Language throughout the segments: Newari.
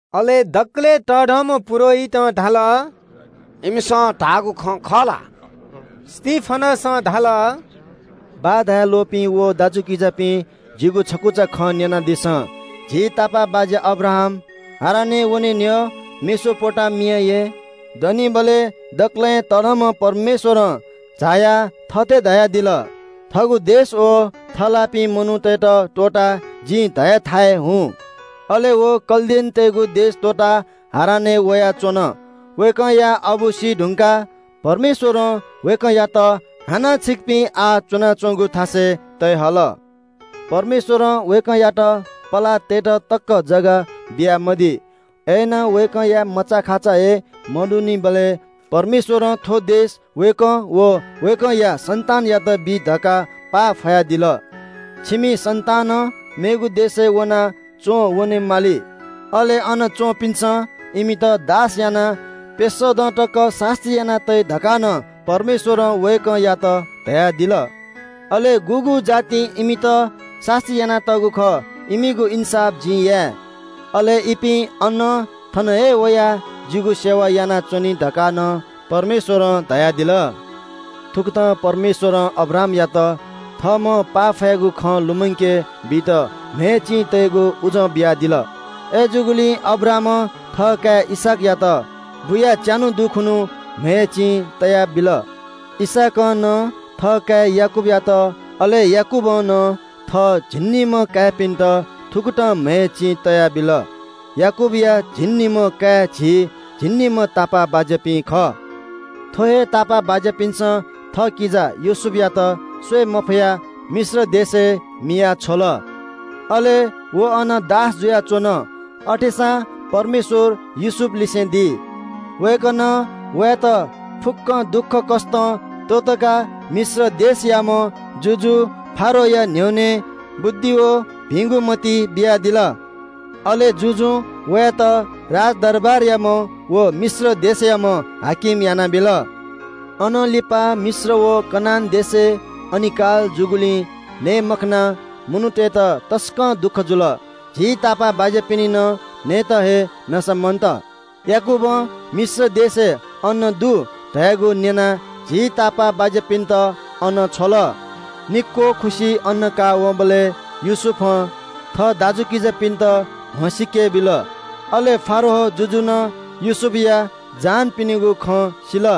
अले दकलय् तःधंम्‍ह पुजाहारीं धाल – “इमिसं धाःगु खँ खः ला?” स्‍तिफनसं धाल – “बाः धाये ल्‍वःपिं व दाजुकिजापिं, जिगु छकुचा खँ न्‍यनादिसँ। झी तापाःबाज्‍या अब्राहाम हारानय् वने न्‍ह्यः मेसोपोटामियाय् दनिबलय् दकलय् तःधंम्‍ह परमेश्‍वरं झायाः थथे धयादिल – ‘थःगु देश व थःलाःपिं मनूतय्‌त त्‍वःताः जिं धयाथाय् हुँ।’ अले व कल्‍दीतय्‌गु देश त्‍वःताः हारानय् च्‍वंवन। अबु सीधुंकाः परमेश्‍वरं वयात झीपिं आः च्‍वनाच्‍वनागु थासय् तये हल। “परमेश्‍वरं वयात पलाः तयेत तकं थाय्‌ बियामदी। अय्‌नं मचाखाचा हे मदुनिबलय् परमेश्‍वरं थ्‍व देश व अले वया सन्‍तानयात बी धकाः पाफयादिल। छिमि सन्‍तानं मेगु देशय् वनाः च्‍वंवने माली, अले अन च्‍वंपिन्‍सं इमित दास यानाः प्‍यसः दँ तकं सास्‍ती याना तइ धकाः नं परमेश्‍वरं वयात धयादिल। अले गुगु जातिं इमित सास्‍ती यानातःगु खः इमिगु इन्‍साफ जिं हे याये। ‘अले इपिं अनं थन हे वयाः जितः आराधना यानाच्‍वनी’ धकाः नं परमेश्‍वरं धयादिल। “थुकथं परमेश्‍वरं अब्राहामयात थःम्‍हं पाफयागु खँ लुमंके बीत म्‍हय् चिं तयेगु बाचा चिनादिल। अय्‌जूगुलिं अब्राहामं थःकाय् इसहाकयात बुयाः च्‍यान्‍हु दुखुन्‍हु म्‍हय् चिं तयाबिल। इसहाकं नं थःकाय् याकूबयात, अले याकूबं नं थः झिंनिम्‍ह काय्‌पिन्‍त थुकथं म्‍हय् चिं तयाबिल। याकूबया झिंनिम्‍ह काय् झी तापाःबाज्‍यापिं खः।” “थ्‍व हे तापाःबाज्‍यापिन्‍सं थःकिजा योसेफयात स्‍वये मफयाः मिश्र देशय् मिया छ्वल। अले व अन दास जुयाच्‍वन। अथेसां परमेश्‍वर योसेफलिसे दी। वय्‌कलं वयात फुक्‍क दुःखकष्‍टं त्‍वःतकाः मिश्र देशयाम्‍ह जुजु फारोहया न्‍ह्यःने बुद्धि व भिंगु मति बियादिल। अले जुजुं वयात राजदरबारयाम्‍ह व मिश्र देशयाम्‍ह हाकिम यानाबिल। “अनं लिपा मिश्र व कनान देशय् अनिकाल जूगुलिं नये मखनाः मनूतय्‌त तसकं दुःख जुल। झी तापाःबाज्‍यापिनि नं नयेत हे नसा मन्‍त। याकूबं मिश्र देशय् अन्‍न दु धयागु न्‍यनाः झी तापाःबाज्‍यापिन्‍त अन छ्वल। निक्‍वः खुसि अन्‍न काःवंबलय् योसेफं थः दाजुकिजापिन्‍त म्‍हसीके बिल। अले फारो जुजुं नं योसेफया जहानपिनिगु खँ सिल।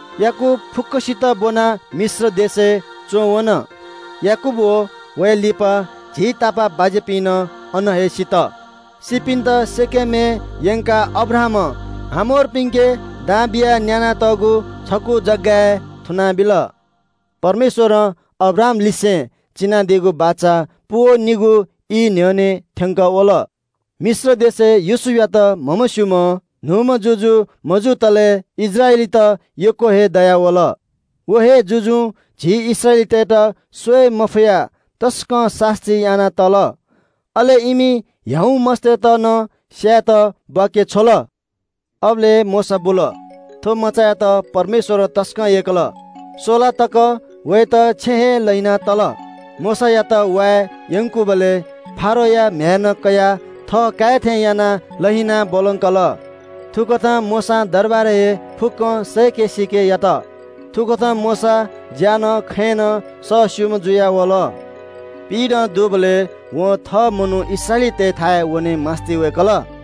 याकूब फुक्‍कसित ब्‍वनाः मिश्र देशय् च्‍वंवन। याकूब व झी तापाःबाज्‍यापिं नं अन हे सित। सीपिन्‍त शकेमय् यंकाः अब्राहामं हमोरपिन्‍के दां बियाः न्‍यानातःगु छकू जगय् थुनाबिल।” “परमेश्‍वरं अब्राहामलिसे चिनादीगु बाचा पूवनीगु ई न्‍ह्यःने थ्‍यंकः वल। मिश्र देशय् योसेफयात म्‍हमस्‍यूम्‍ह न्‍हूम्‍ह जुजु मजुतले इस्राएलीत यक्‍व हे दयावल। व हे जुजुं झी इस्राएलीतय्‌त स्‍वये मफयाः तसकं सास्‍ती याना तल। अले इमि ह्याउँ मस्‍तय्‌त नं स्‍यायेत वांछ्वय्‌के बीगु। “अबलय् हे मोशा बुल। थ्‍व मचायात परमेश्‍वरं तसकं यय्‌कल। स्‍वला तक वयात छेँय् हे लहिना तल। मोशायात वाये यंकूबलय् फारोया म्‍ह्याय्‌नं कयाः थःकाय् थें यानाः लहिनाः ब्‍वलंकल। थुकथं मोशां दरबारय् हे मिश्रतय्‌गु फुक्‍कं ज्ञान सय्‌के सीके यात। थुकथं मोशा ज्‍याय् नं खँय् नं सःस्‍यूम्‍ह जुयावल।” “पिइदँ दुबलय् वं थः मनू इस्राएली दाजुकिजातय्‌थाय् वने मास्‍ति वय्‌कल।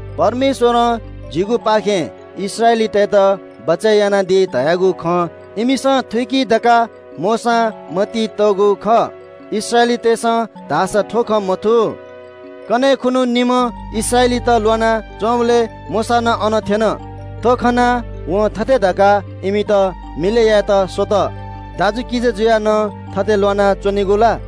परमेश्‍वरं जिगुपाखें इस्राएलीतय्‌त बचय् यानादी धयागु खँ इमिसं थुइकी धकाः मोशां मतिइ तःगु खः। इस्राएलीतय्‌सं धाःसा थ्‍व खँ मथू। “कन्‍हय् खुन्‍हु निम्‍ह इस्राएलीत ल्‍वाना च्‍वंबलय् मोशा नं अन थ्‍यन। थ्‍व खनाः वं थथे धकाः इमित मिलय् यायेत स्‍वल – ‘दाजुकिजा जुयाः नं थथे ल्‍वाना च्‍वनेगु ला?’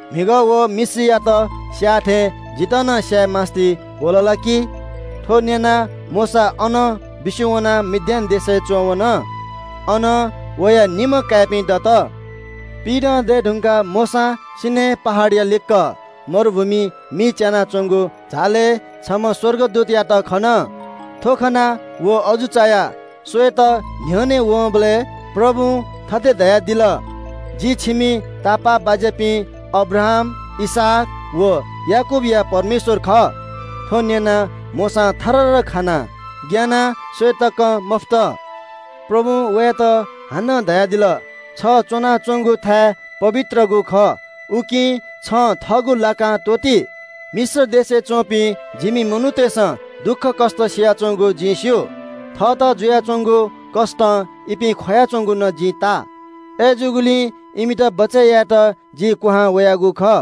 म्‍हिगः व मिश्रीयात स्‍याः थें जितः नं स्‍याये मास्‍ति वः ला छु?’ थ्‍व न्‍यनाः मोशा अनं बिस्‍युं वनाः मिद्यान देशय् च्‍वंवन। अन वया निम्‍ह काय्‌पिं दत।” “पिइदँ दये धुंकाः मोशां सीनै पहाडया लिक्‍क मरुभूमिइ मि च्‍यानाच्‍वंगु झालय् छम्‍ह स्‍वर्गदूतयात खन। थ्‍व खनाः व अजू चायाः स्‍वयेत न्‍ह्यःने वंबलय् परमप्रभुं थथे धयादिल – ‘जि छिमि तापाःबाज्‍यापिं अब्राहाम, इसहाक व याकूबया परमेश्‍वर खः।’ थ्‍व न्‍यनाः मोशां थररर खानाः ग्‍यानाः स्‍वये तकं मफुत। “परमप्रभुं वयात हानं धयादिल – ‘छ दनाच्‍वंगु थाय् पवित्रगु खः। उकिं छं थःगु लाकां त्‍वःति। मिश्र देशय् च्‍वंपिं जिमि मनूतय्‌सं दुःखकष्‍ट सियाच्‍वंगु जिं स्‍यू। थःत जुयाच्‍वंगु कष्‍टं इपिं ख्‍वयाच्‍वंगु नं जिं ताः। अय्‌जूगुलिं इमित बचय् यायेत जि क्‍वहां वयागु खः।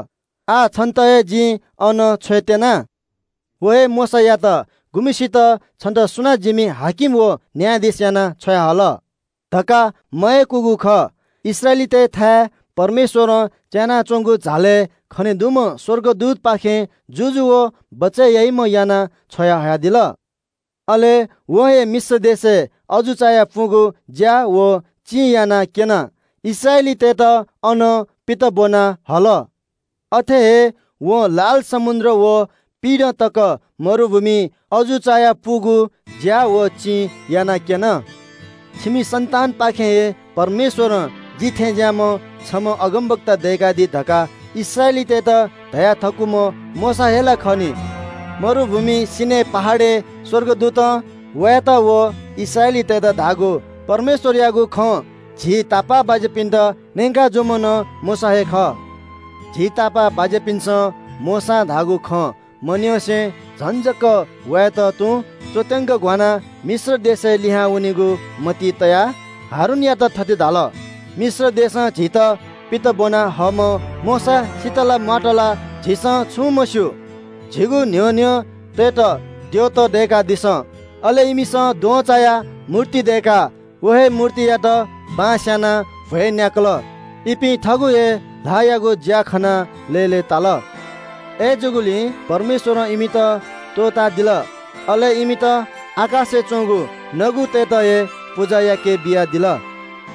आः छन्‍त हे जिं अन छ्वयेत्‍यना।’ “व हे मोशायात, गुम्‍हय्‌सित ‘छन्‍त सुनां जिमि हाकिम व न्‍यायाधीश यानाः छ्वयाहल?’ धकाः मयय्‌कूगु खः, वयात हे इस्राएलीतय्‌थाय् परमेश्‍वरं च्‍यानाच्‍वंगु झालय् खने दुम्‍ह स्‍वर्गदूतपाखें हाकिम व छुत्‍कारा बीम्‍ह याना छ्वयाहयादिल। अले वं हे मिश्र देशय् अजू चायापुगु ज्‍या व चिं यानाक्‍यनाः इस्राएलीतय्‌त अनं पित ब्‍वना हल। अथे हे वं लाल समुद्र व मरुभूमिइ पिइदँ तक अजू चायापुगु ज्‍या व चिं यानाक्‍यन। “‘छिमि इस्राएली दाजुकिजापाखें हे परमेश्‍वरं जि थें ज्‍याःम्‍ह छम्‍ह अगमवक्ता छ्वयाहयादी’ धकाः इस्राएलीतय्‌त धया थकूम्‍ह मोशा हे ला खः नि। मरुभूमिइ सीनै पहाडय् स्‍वर्गदूतं वयात व इस्राएलीतय्‌त धाःगु परमेश्‍वरयागु खँ झी तापाःबाज्‍यापिन्‍त न्‍यंका जूम्‍ह नं मोशा हे खः। “झी तापाःबाज्‍यापिन्‍सं मोशां धाःगु खँ मन्‍यंसे झन जक वयात तुं च्‍वत्‍यंक घ्‍वानाः मिश्र देशय् लिहां वनेगु मतिइ तयाः हारूनयात थथे धाल – ‘मिश्र देशं झीत पित ब्‍वना हःम्‍ह मोशा सित ला म्‍वात ला झीसं छुं मस्‍यू। झीगु न्‍ह्यः न्‍ह्यः वनेत द्यःत दय्‌कादिसँ।’ अले इमिसं द्वहंचाया मूर्ति दय्‌काः व हे मूर्तियात बलि बियाः भ्‍वय् न्‍याय्‌कल। इपिं थःगु हे ल्‍हाःयागु ज्‍या खनाः लय्‌लय्‌ताल। अय्‌जूगुलिं परमेश्‍वरं इमित त्‍वःतादिल, अले इमित आकाशय् च्‍वंगु नगुतय्‌त हे पुजा याकेबियादिल।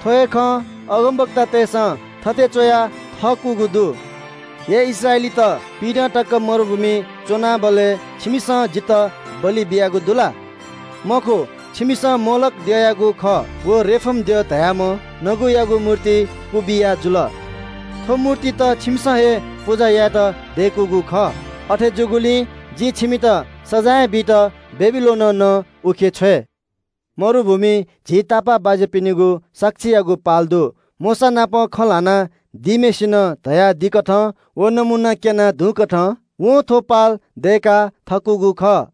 थ्‍व हे खँ अगमवक्तातय्‌सं थथे च्‍वया थकूगु दु – “‘हे इस्राएलीत, पिइदँ तक मरुभूमिइ च्‍वनाबलय् छिमिसं जितः बलि बियागु दु ला? मखु, छिमिसं मोलोख द्यःयागु खः व रेफन द्यः धाःम्‍ह नगुयागु मूर्ति क्‍वबिया जुल। थ्‍व मूर्तित छिमिसं हे पुजा यायेत दय्‌कूगु खः। अथे जूगुलिं जिं छिमित सजाँय बीत बेबिलोनं नं उखे छ्वये।’” “मरुभूमिइ झी तापाःबाज्‍यापिनिगु नापलाय्‌गु पाल दु। मोशानापं खँ ल्‍हाना दीम्‍हय्‌सिनं धयादीकथं व नमूना क्‍यनादीगुकथं वं थ्‍व पाल दय्‌का थकूगु खः।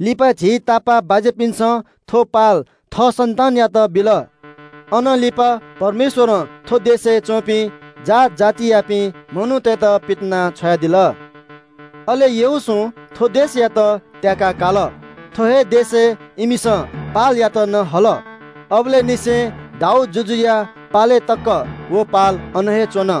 लिपा झी तापाःबाज्‍यापिन्‍सं थ्‍व पाल थः सन्‍तानयात बिल। अनं लिपा परमेश्‍वरं थ्‍व देशय् च्‍वंपिं जात जातियापिं मनूतय्‌त पितिनाछ्वयादिल। अले यहोशूं थ्‍व देशयात त्‍याका काल। थ्‍व हे देशय् इमिसं पालयात नं हल। अबलय् निसें दाऊद जुजुया पालय् तकं व पाल अन हे च्‍वन।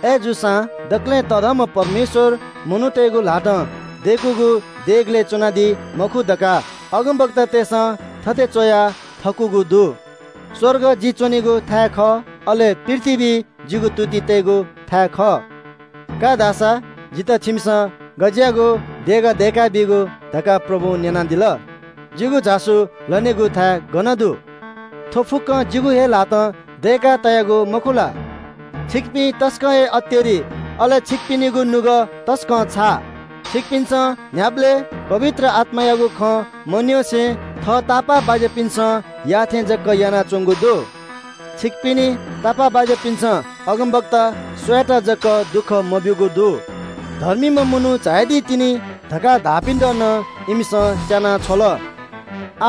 अय्‌जूसां दकलय् तःधंम्‍ह परमेश्‍वर मनूतय्‌गु ल्‍हातं दय्‌कूगु देगलय् च्‍वनादी मखु धकाः अगमवक्तातय्‌सं थथे च्‍वया थकूगु दु – “‘स्‍वर्ग जि च्‍वनेगु थाय् खः, अले पृथ्‍वी जिगु तुति तयेगु थाय् खः। का धा सा, जितः छिमिसं गज्‍याःगु देगः दय्‌का बीगु’ धकाः परमप्रभुं न्‍यनादिल। ‘जिगु झासु लनेगु थाय् गन दु? थ्‍व फुक्‍कं जिगु हे ल्‍हातं दय्‌का तयागु मखु ला?’” “छिकपिं तसकं हे अतेरि, अले छिकपिनिगु नुगः तसकं छाः। छिकपिन्‍सं न्‍ह्याबलें पवित्र आत्‍मायागु खँ मन्‍यंसे थः तापाःबाज्‍यापिन्‍सं याःथें जक यानाच्‍वंगु दु। छिकपिनि तापाःबाज्‍यापिन्‍सं अगमवक्ता सुयात जक दुःख मब्‍यूगु दु? धर्मीम्‍ह मनू झायादी तिनि धकाः धाःपिन्‍त नं इमिसं स्‍याना छ्वल।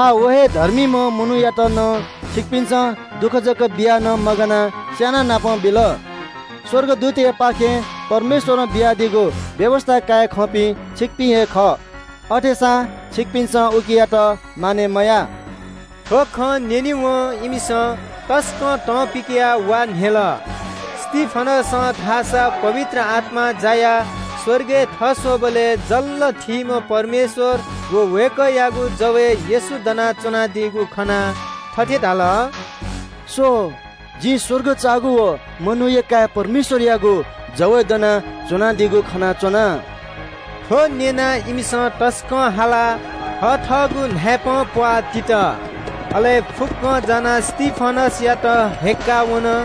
आः व हे धर्मीम्‍ह मनूयात नं छिकपिन्‍सं दुःख जक बियाः मगानाः धोखा बियाः स्‍यानाबिल। स्‍वर्गदूततय्‌पाखें परमेश्‍वरं बियादीगु व्‍यवस्‍था काये खंपिं छिकपिं हे खः, अथेसां छिकपिन्‍सं उकियात मानय् मयाः।” थ्‍व खँ न्‍यनेवं इमिसं तसकं तं पिकयाः वा न्‍ह्यल। स्‍तिफनसं धाःसा पवित्र आत्‍मां जायाः स्‍वर्गय् थस्‍वःबलय् जल्‍ल थीम्‍ह परमेश्‍वर व वय्‌कःयागु जवय् येशू दनाच्‍वनादीगु खनाः थथे धाल – “स्‍व, जिं स्‍वर्ग चाःगु व मनूया काय् परमेश्‍वरयागु जवय् दनाच्‍वनादीगु खनाच्‍वना।” थ्‍व न्‍यनाः इमिसं तसकं हालाः थथःगु न्‍हाय्‌पंप्‍वाः तित। अले फुक्‍कं जानाः स्‍तिफनसयात हय्‌क्‍काः वन।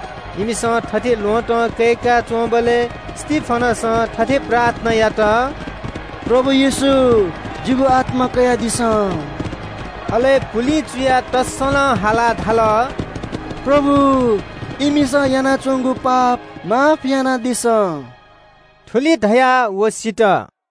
इमिसं थथे ल्‍वहँतं कय्‌का च्‍वंबलय् स्‍तिफनसं थथे प्रार्थना यात – “प्रभु येशू, जिगु आत्‍मा कयादिसँ।” अले पुलिं चुयाः तःसलं हालाः धाल – “प्रभु, इमिसं यानाच्‍वंगु पाप क्षमा यानादिसँ।” थुलि धयाः व सित।